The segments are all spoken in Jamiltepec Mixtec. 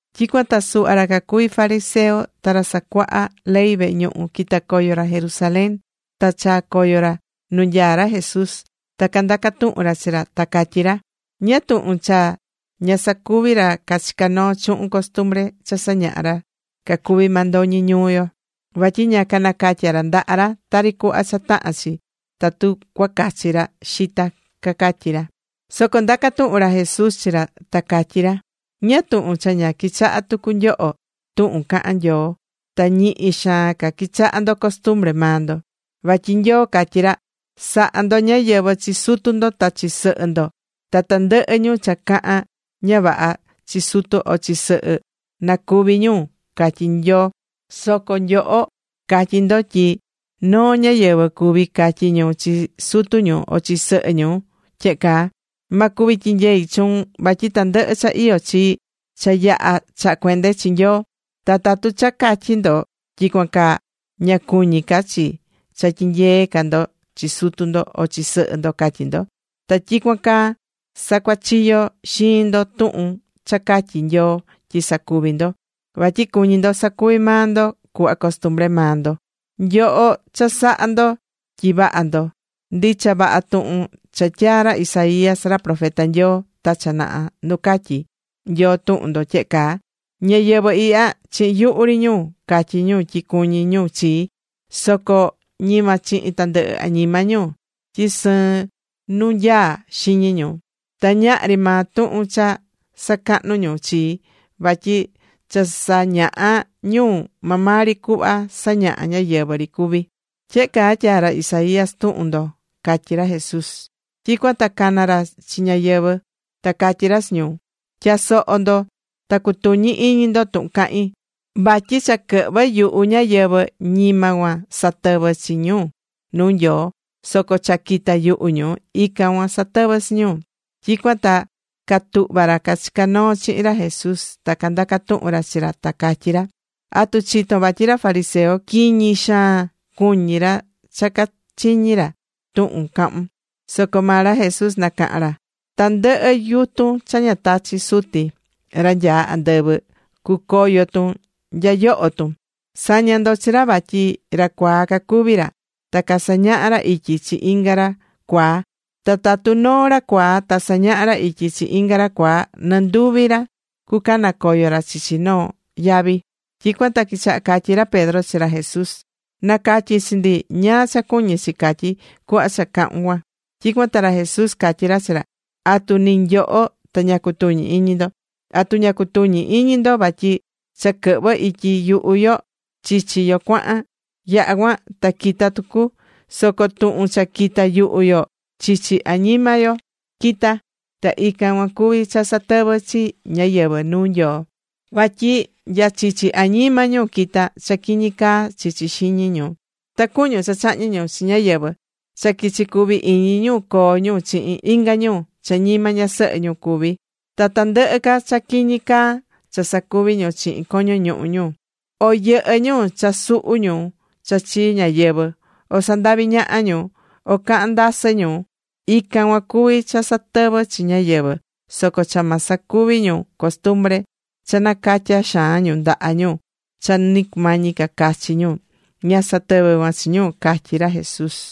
Tyicuan ta suhva ra cacuví fariseo ta ra casacuaha ley vehe ñuhu quita̱ coyo ra Jerusalén. Ta chaa̱ coyo ra nu nyaá ra Jesús ta candaca̱ tuhun ra chi ra, ta catyí ra: ―¿Ñáá tuhun cha ña sacuví ra cachicá noo chuhun costumbre cha sañahá ra cacuví mandoñi ñuu yo? Vatyi ña canacatyá ra ndaha ra tari cuhva cha tahán chi, tatu cuacachi ra xita ―cacatyí ra. Soco ndaca̱ tuhun ra Jesús chi ra, ta catyí ra: ―¿Ñáá tuhun cha ña quichahá tucu nyoho tuhun cahán Nyoo ta ñihi xaan ca quichaha ndo costumbre maa ndo? Vatyi Nyoo catyí ra: “Sa̱ha ndo ñáyɨvɨ chi sutu ndo ta chi sɨhɨ ndo. Ta tandɨhɨ ñu cha cahán ña vaha chi sutu o chi sɨhɨ, na cúvi ñu”, catyí Nyoo. Soco nyoho catyí ndo tyi noo ñáyɨvɨ cuví catyí ñu chi sutu ñu o chi sɨhɨ ñu tyehe caa: “Ma cuvi tyinyei chuun vatyi tandɨhɨ cha iyó chii cha yaha̱ chaha̱ cuende chi Nyoo.” Ta tatu cha catyi̱ ndo tyicuan caa, ña cuñí ca chi cha tyinyee ca ndo chi sutu ndo o chi sɨhɨ ndo, catyí ndo. Ta tyicuan caa sacuachiyó xiin ndo tuhun cha catyi̱ Nyoo tyi sacuvi ndo, vatyi cuñí ndo sacuvi maa ndo cuhva costumbre maa ndo. ¡Nyoho cha sahá ndo tyi vaha ndo! Ndicha vaha tuhun cha tyaa̱ ra Isaías, ra profeta Nyoo ta cha naha nu catyí Nyoo tuhun ndo tyehe caa: Ñáyɨvɨ ihya, chihin yuhu ri ñu catyí ñu tyi cuñí ñu chii. Soco ñima chihin tandɨhɨ añima ñu, tyi sɨɨn nu nyaá xiñi ñu. Ta ñahri maa tuhun cha sacahnú ñu chii. Vatyi cha sañahá ñu maa maa ri cuhva sañahá ñáyɨvɨ ri cuví, tyehe caa tyaa̱ ra Isaías tuhun ndo, catyí ra Jesús. Tyicuan ta cana̱ ra chi ñáyɨvɨ ta catyí ra chi ñu: ―Tya̱soho ndo, ta cu̱tuñi iñi ndo tuhun cahín. Vatyi cha quɨhvɨ́ yuhu ñáyɨvɨ, ñima cuan satɨvɨ́ chi ñu nuu Nyoo. Soco cha quitá yuhu ñu, ican cuan satɨvɨ́ chi ñu. Tyicuan ta catuhva̱ ra cachicá noo chihin ra Jesús ta candaca̱ tuhun ra chi ra, ta catyí ra: ―¿Atu chitón vatyi ra fariseo quiñi xaan cuñí ra cha cachiñi̱ ra tuhun cahún? Soco maa ra Jesús nacaha̱n ra: ―Tandɨhɨ yutun cha ña tachi̱ Suti, ra nyaá andɨvɨ, cucoyo tun nya yoho tun. Sa̱ña ndo chi ra vatyi ra cuaa cacuví ra, ta casañahá ra ityi chi inga ra cuaa. Ta tatu noo ra cuaa ta sañahá ra ityi chi inga ra cuaa, nɨ nduvi ra cucanacoyo ra chichi noo yavi. Tyicuan ta quichaha catyí ra Pedro chi ra Jesús: ―Na̱catyi chi ndi ñáá cha cuñí chi catyí cuhva cha cahu̱n cuan. Tyicuan ta ra Jesús catyí ra chi ra: ―¿Atu ni nyoho ta ña cutuñi iñi ndo? ¿Atu ña cutuñí iñi ndo vatyi cha quɨhvɨ ityi yuhu yo, chichi yo cuahan? Yaha̱ cuan ta quita tucu. Soco tuhun cha quitá yuhu yo, chichi añima yo quitá, ta ican cuan cuví cha satɨvɨ́ chi ñáyɨvɨ nuu Nyoo. Vatyi nya chichi añima ñu quitá cha quiñi caá chicá xiñi ñu. Ta cuñun, cha chahñi ñu chi ñáyɨvɨ, cha quichi cuvi iñi ñu coo ñu chihin inga ñu cha ñima ñasɨhɨ ñu cuví. Ta tandɨhɨ ca cha quiñi caa cha sacuvi ñu chihin coño ñuhu ñu. O yɨhɨ́ ñu cha suhu ñu cha chii ñáyɨvɨ. O sandaví ñaha ñu. O cahán ndasɨ ñu. Ican cuan cuví cha satɨvɨ́ chi ñáyɨvɨ. Soco cha ma sacuvi ñu costumbre cha nacatyá xaan ñu ndaha ñu cha ni cumañi ca cachi ñu, ña satɨvɨ́ cuan chi ñu ―catyí ra Jesús.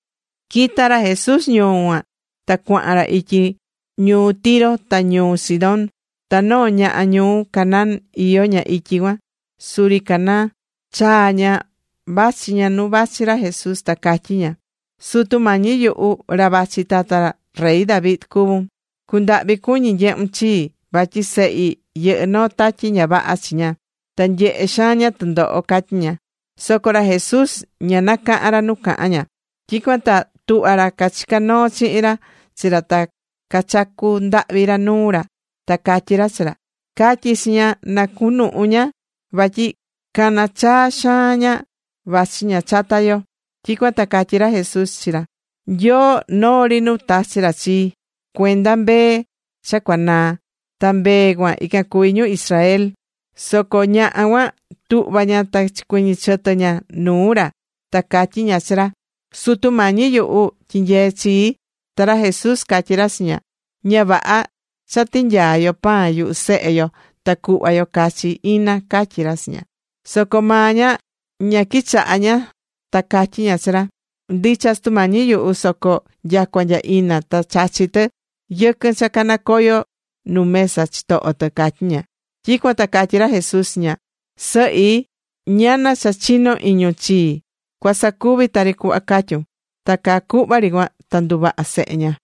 Quita̱ ra Jesús ñuu cuan ta cuahan ra ityi ñuu Tiro ta ñuu Sidón. Ta noo ñaha ñuu Canaan iyó ña ityi cuan, suri caná chaa ña vachi ña nu vachi ra Jesús, ta catyí ña: ―Sutu Mañi yuhu, ra vachi tata rey David cuvún. Cu̱ndahvi cuñi nyehun chii, vatyi sehi yɨhɨ́ noo tatyi ña vaha chi ña, ta nyehé xaan ña tɨndoho ―catyí ña. Soco ra Jesús ña nacaha̱n ra nu cahán ña. Tyicuan ta tuhva ra cachicá noo chihin ra chi ra ta cachacu̱ ndahvi ra nuu ra ta catyí ra chi ra: ―Ca̱tyi chi ña na cunuhu ña vatyi caná chaa xaan ña vachi ña chata yo. Tyicuan ta catyí ra Jesús chi ra: ―Nyoo noo ri nu tachi̱ ra chii, cuenda mbee cha cuanaa. Ta mbee cuan ican cuví ñu ñuu Israel. Soco ñaha cuan tuhva̱ ña ta chicuiñi̱ chɨtɨ ña nuu ra ta catyí ña chi ra: ―Sutu Mañi yuhu, ¡tyi̱nyee chii! Ta ra Jesús catyí ra chi ña: ―Ña vaha cha tinyaa yo pan yuhu sehe yo ta cuhva yo cachi ina ―catyí ra chi ña. Soco maa ña ña quichaha̱ ña ta catyí ña chi ra: ―Ndicha, Sutu Mañi yuhu. Soco nyacua nya ina ta chachí tɨ yɨquɨn cha canacoyo nu mesa chitoho tɨ ―catyí ña. Tyicuan ta catyí ra Jesús chi ña: ―Sɨhi ¡ñana cha chinó xaan iñun chii! Cua sacuvi tari cuhva cuñún. Ta caa cuhva ri cuan ta nduvaha̱ sehe ña.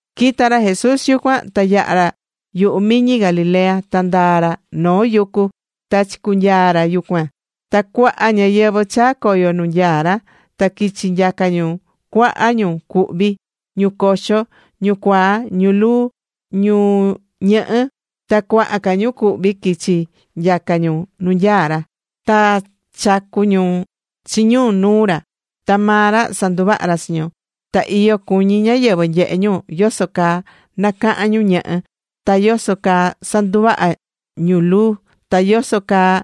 Quita̱ ra Jesús yucuan ta yaha̱ ra yuhu miñi Galilea, ta ndaa̱ ra noo yucu ta chicunyaa̱ ra yucuan. Ta cuaha ñáyɨvɨ chaa̱ coyo nu nyaá ra ta quichi nyaca ñu cuaha ñu cuhví: ñu coxo, ñu cuaa, ñu luu, ñu ñɨhɨ. Ta cuaha ca ñu cuhví quichi nyaca ñu nu nyaá ra. Ta chacu̱n ñu chi ñu nuu ra, ta maa ra sanduvaha̱ ra chi ñu. Ta iyo cuñí ñáyɨvɨ nyehé ñu yoso caa nacaha̱n ñu ñɨhɨ ta yoso caa nduvaha̱ ñu luu, ta yoso caa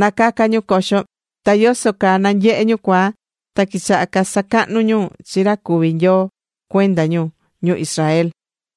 nacacá ñu coxo, ta yoso caa nanyehé ñu cuaa. Ta quichaha casacahnu ñu chi ra cuví Nyoo cuenda ñu, ñu Israel.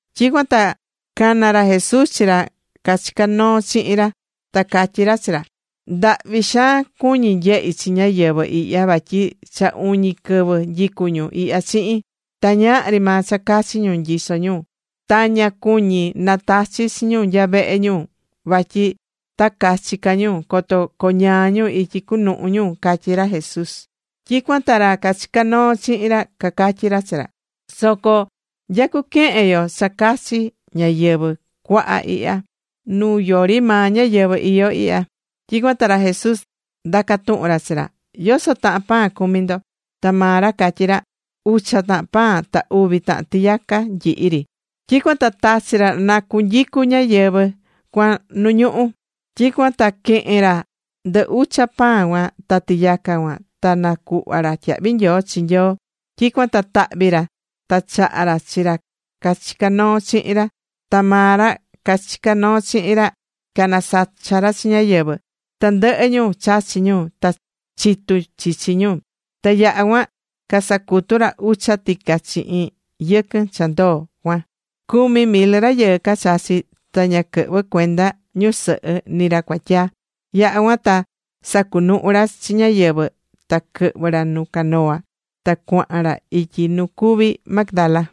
Tyicuan ta cana̱ ra Jesús chi ra cachicá noo chihin ra, ta catyí ra chi ra: ―Ndahvi xaan cuñí nyehi chi ñáyɨvɨ ihya, vatyi cha uñi quɨvɨ nyicú ñu ihya chihin, ta ñahri maa cha cachi ñu nyisó ñu. Ta ña cuñí natachi chi ñu nya vehe ñu vatyi ta cachi ca ñu, coto coñaa ñu ityi cunuhu ñu ―catyí ra Jesús. Tyicuan ta ra cachicá noo chihin ra cacatyí ra chi ra: ―Soco ¿nya cuquehen yo cha cachi ñáyɨvɨ cuaha ihya, nu yori maa ñáyɨvɨ iyó ihya? Tyicuan ta ra Jesús ndaca̱ tuhun ra chi ra: ―¿Yoso tahan pan cumí ndo? Ta maa ra catyí ra: ―Ucha tahan pan, ta uvi tahan tiyaca nyihi ri. Tyicuan ta tachi̱ ra na cunyicu ñáyɨvɨ cuan nu ñuhú. Tyicuan ta quehe̱n ra ndɨ ucha pan cuan ta tiyaca cuan, ta nacuhva̱ ra tyahvi nyoo chi Nyoo. Tyicuan ta tahvi̱ ra ta chaha̱ ra chi ra cachicá noo chihin ra, ta maa ra cachicá noo chihin ra canasacha̱ ra chi ñáyɨvɨ. Tandɨhɨ ñu chachi ñu, ta chitu̱ chichi ñu. Ta yaha̱ cuan casacutu̱ ra ucha tica chihin yɨquɨn cha ndoo cuan. Cumi mil rayɨɨ cachachi̱, ta ña quɨhvɨ̱ cuenda ñusɨhɨ nɨ ri ra cuatyaa. Yaha̱ cuan ta sacunuhu ra chi ñáyɨvɨ, ta quɨhvɨ̱ ra nu canoa, ta cuahan ra ityi nu cuví Magdala.